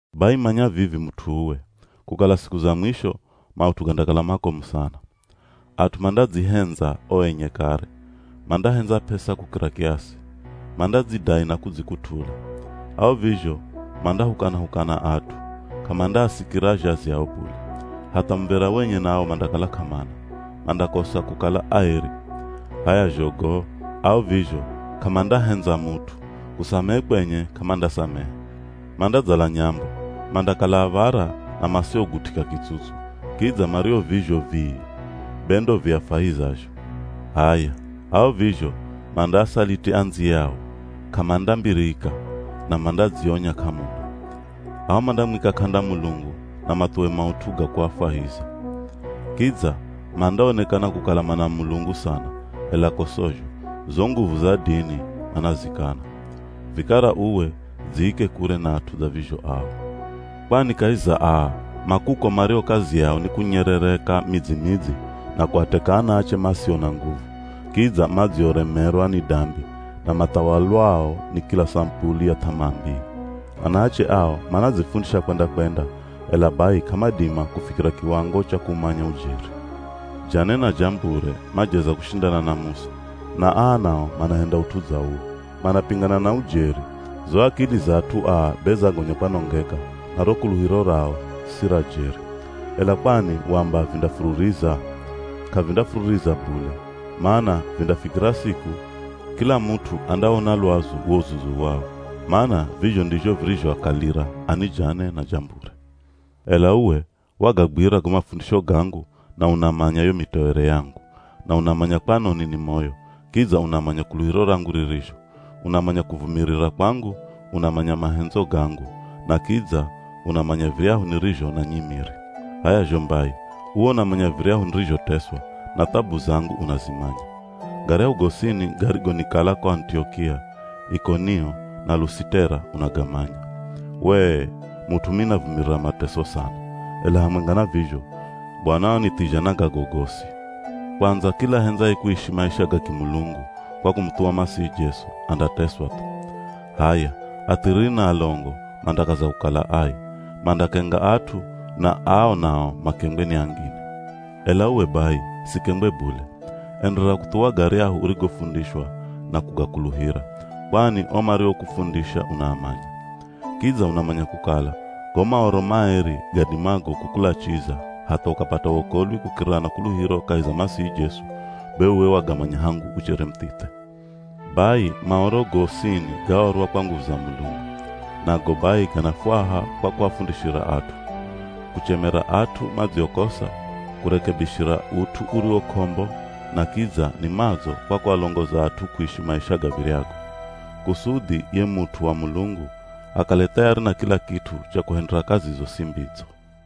Bai manya vivi mut'u uwe, kukala siku za mwisho maut'u gandakala makomu sana. At'u mandadzihendza o enye kare, mandahendza p'esa kukira kiasi, mandadzidai na kudzikut'ula. Ao vizho mandahukana-hukana at'u, k'amandaasikira azhazi ao bule, hatha muv̱era wenye nawo mandakala k'amana, mandakosa kukala aeri. H'aya zho go, ao vizho k'amandahendza mut'u, kusamehe kwenye k'amandasamehe, mandadzala nyambo, mandakala av̱ara na masiogut'ika kitsutsu, kidza mario vizho vii be ndo viafwahizazho. H'aya, ao vizho mandaasaliti andziyao k'amandambirika, na mandadzionya k'amuna. Ao mandamwika k'anda Mulungu na mathuwe maut'u ga kuafwahiza. Kidza mandaonekana kukala mana Mulungu sana, ela ko sozho, zo nguvu za dini manazikana. Vikara uwe dziike kure na at'u dza vizho ao. Kwani kahi za aa, ma kuko mario kazi yao ni kunyerereka midzi-midzi na kuateka anaache masio na nguvu, kidza madzioremerwa ni dambi na mathawalwao ni kila samupuli ya th'amaa mbii. Anaache ao manadzifundisha kwenda-kwenda, ela bai k'amadima kufikira kiwango cha kuumanya ujeri. Jane na Jambure majeza kushindana na Musa, na aa nao manahenda ut'u dza uwo, manapingana na ujeri, zo akili za at'u aa be zagonya kwanongeka na ro kuluhiro rao si ra jeri. Ela kwani wamba vindafururiza? K'avindafururiza bule, mana vindafikira siku, kila mut'u andawona lwazu wo uzuzu wao, mana vizho ndizho virizhoakalira ani Jane na Jambure. Ela uwe, wagagwira go mafundisho gangu na unamanya yo mitoere yangu, na unamanya kwanoni ni moyo, kidza unamanya kuluhiro rangu ririzho, unamanya kuvumirira kwangu, unamanya mahendzo gangu na kidza unamanya viryahu nirizho na nyimiri. H'aya zho mbai, uwe unamanya viryahu nirizhoteswa na thabu zangu unazimanya. Garyahu gosini garigonikala ko Anitiokia, Ikonio na Lusitera unagamanya. Wee, mut'u mimi navumirira mateso sana. Ela hamwenga na vizho Bwana wanithizha na gago gosi. Kwandza kila ahendzaye kuishi maisha ga kimulungu kwa kumuthuwa Masihi Jesu, andateswa thu. H'aya athiriri na alongo mandakaza kukala ai, mandakenga at'u na ao nao makengwe ni angine. Ela uwe bai, sikengwe bule, enderera kuthuwa garyahu urigofundishwa na kugakuluhira, kwani o mariokufundisha unaamanya. Kidza unamanya kukala go Maoro maeri gadimago kukulachiza hatha ukapata wokolwi kukirira na kuluhiro kahi za Masihi Jesu, be uwe wagamanya hangu uchere muthithe. Bai Maoro gosini gaorwa kwa nguvu za Mulungu, nago bai ganafwaha kwa kuafundishira at'u, kuchemera at'u madziokosa, kurekebishira ut'u uriwo k'ombo na kidza ni madzo kwa kualongoza at'u kuishi maisha gav̱iryago. Kusudhi ye mut'u wa Mulungu akale thayari na kila kit'u cha kuhendera kazi zosi mbidzo.